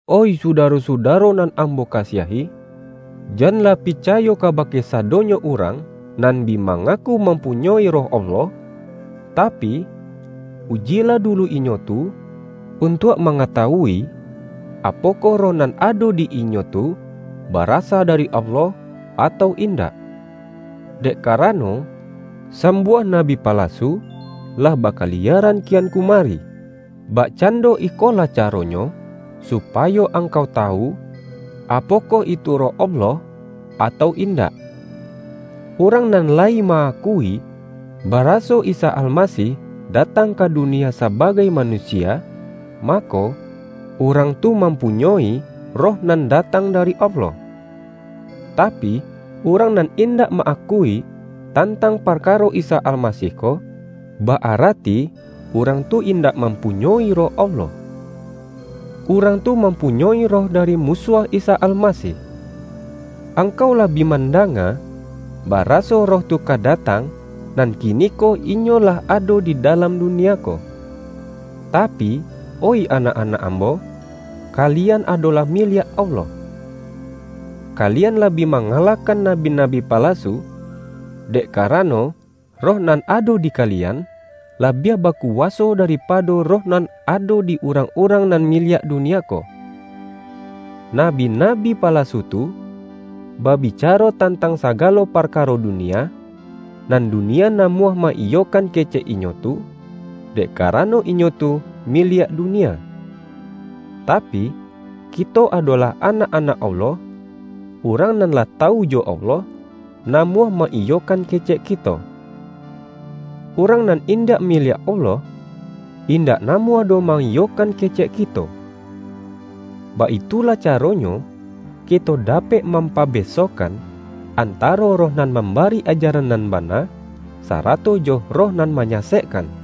Oih sudaro-sudaro nan ambo ka-siahi! Janlah picayo kabake sa-donyo urang nan bi mangaku mam-punyoi Roh Allah, tapi, ujilah dulu inyo tu, untuak mangatawui, apokoh roh nan ado di inyo tu, barasa dari Allah, atau indak. Dek karano, sam-buah nabi palasu lah bakaliyaran ki-an kumari. Bakcando ikolah caronyo supayo angkau tawu, apokoh itu Roh Allah, atau indak: Urang nan layi ma-akui, baraso Isa Almasih datang ka dunia sabagai manusia, mako, urang tu mampunyoi Roh nan datang da-ri Allah. Tapi, urang nan indak ma-akui tantang parkaro Isa Almasih ko, ba-arati urang tu indak mampunyoi Roh Allah. Urang tu mampunyoi roh dari Musuah Isa Almasih. Angkau lah bi mandanga, baraso roh tu ka da-tang, nan kiniko inyo lah ado di da-lam dunia ko. Tapi, oih anak-anak ambo, kali-an adolah miliak Allah. Kalian lah bi mangalahkan nabi-nabi palasu, dek karano, Roh nan ado di kalian, la-biah bakuwaso daripado roh nan ado di urang-urang nan miliak dunia ko. Nabi-nabi palasu tu, babicaro tan-tang sagalo parkaro dunia, nan dunia namuah ma-iyokan kecek inyo tu, dek karano inyo tu miliak dunia. Tapi, kito adolah anak-anak Allah; urang nan lah tawu jo Allah, namuah ma-iyokan kecek kito. Urang nan indak miliak Allah, indak namuah doh ma-iyokan kecek kito. Baitu lah caronyo kito dapek mampabesohkan, antaro Roh nan mambari ajaran nan bana, sarato jo roh nan manyasekkan.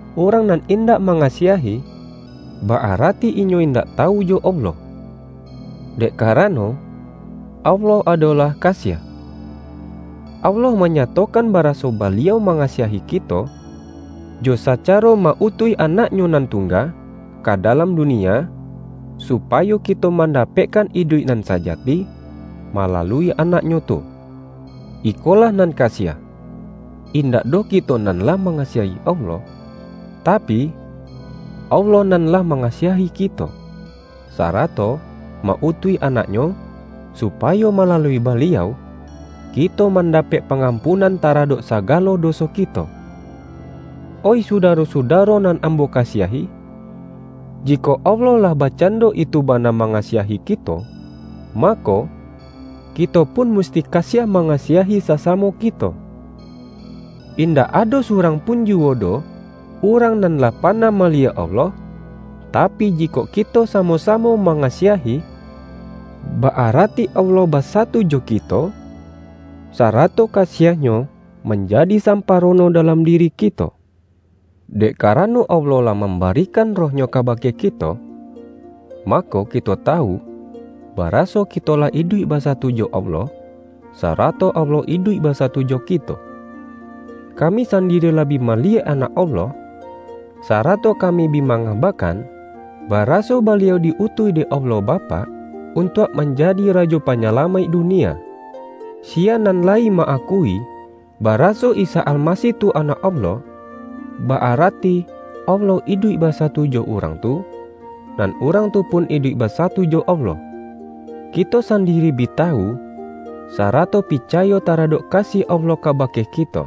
Urang nan indak ma-ngasiahi, ba-arati inyo indak tawu jo Allah; dek karano, Allah adolah ka-siah. Allah manyatokan baraso Ba-liau mangasiahi kito, jo sacaro ma-utuih Anak-Nyo nan tungga ka dalam dunia, supayo kito mandapekkan iduik nan sajati, malalui Anak-Nyo tu. Ikolah nan kasiah: Indak doh kito nan lah mangasiahi Allah, tapi, Allah nan lah mangasiahi kito, sarato ma-utuih Anak-Nyo, supayo malalui Baliau, kito mandapek pangampunan taradok sagalo doso kito. Oih sudaro-sudaro nan ambo ka-siahi, jikok Allah lah bakcando itu ba-na mangasiahi kito, mako, kito pun musti kasiah mangasiahi sasamo ki-to. Indak ado surang pun juwo doh urang nan lah panah maliyek Allah, tapi, jikok kito samo-samo manga-siahi, ba-arati Allah basatu jo kito, sarato kasiah-Nyo manjadi samparo-no dalam diri kito. Dek karano Allah lah mambari-kan Roh-Nyo kabake kito, mako ki-to tawu, baraso kito lah iduik basa-tu jo Allah, sarato Allah iduik basatu jo kito. Kami sandiri lah bi mali-yek Anak Allah, sarato kami bi ma-ngabakan baraso Baliau di-utuih dek Allah Bapak, untuak manjadi Rajo Panyalamaik dunia. Siya nan layi ma-akui, baraso Isa Almasih tu Anak Allah, ba-arati Allah iduik basatu jo urang tu, nan urang tu pun iduik ba-satu jo Allah. Kito sandiri bi tawu, sarato picayo taradok kasiah Allah kabake kito.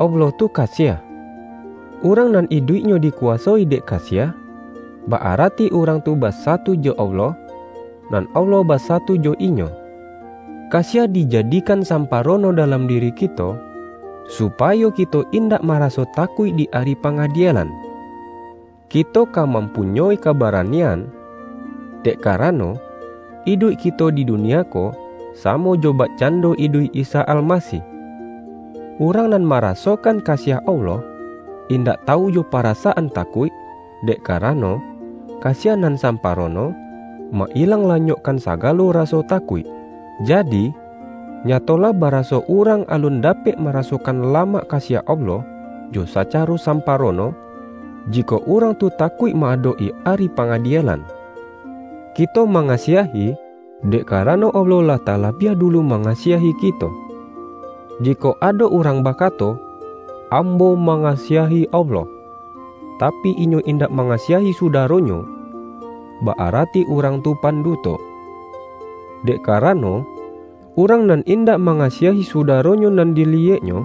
Allah tu kasiah. Urang nan iduiknyo dikuwasoi dek kasiah, ba-arati urang tu basatu jo Allah, nan Allah basatu jo inyo. Kasiah dijadikan sampa-rono dalam diri kito, supayo kito in-dak maraso takuik di Ari Pangadie-lan. Kito ka mampunyoi kabaranian, dek karano, iduik kito di dunia ko, samo jo bakcando iduik Isa Almasih. Urang nan marasokan kasiah Allah, indak tawu jo parasaan takuik; dek karano, kasiah nan samparono, ma-ilang lanyokkan sagalo raso takuik. Jadi, nyatolah baraso urang alun da-pek marasokan lamak kasiah Allah jo sacaro samparono, jikok urang tu ta-kuik ma-adok-i Ari Pangadielan. Kito mangasiahi, dek karano Allah lah talabiah dulu mangasiahi kito. Jikok ado urang bakato,”Am-bo mangasiahi Allah,” tapi, inyo in-dak mangasiahi sudaronyo, ba-arati urang tu panduto. Dek karano, urang nan indak mangasiahi sudaronyo nan diliyeknyo,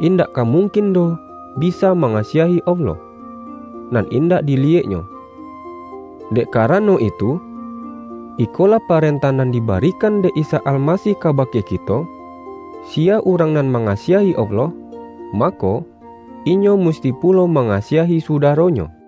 indak ka mungkin doh bi-sa mangasiahi Allah, nan indak dili-yeknyo. Dek karano itu, ikolah pa-rentah nan dibarikan dek Isa Almasih kabake kito: Siya urang nan manga-siahi Allah, mako, inyo musti pulo mangasiahi sudaronyo.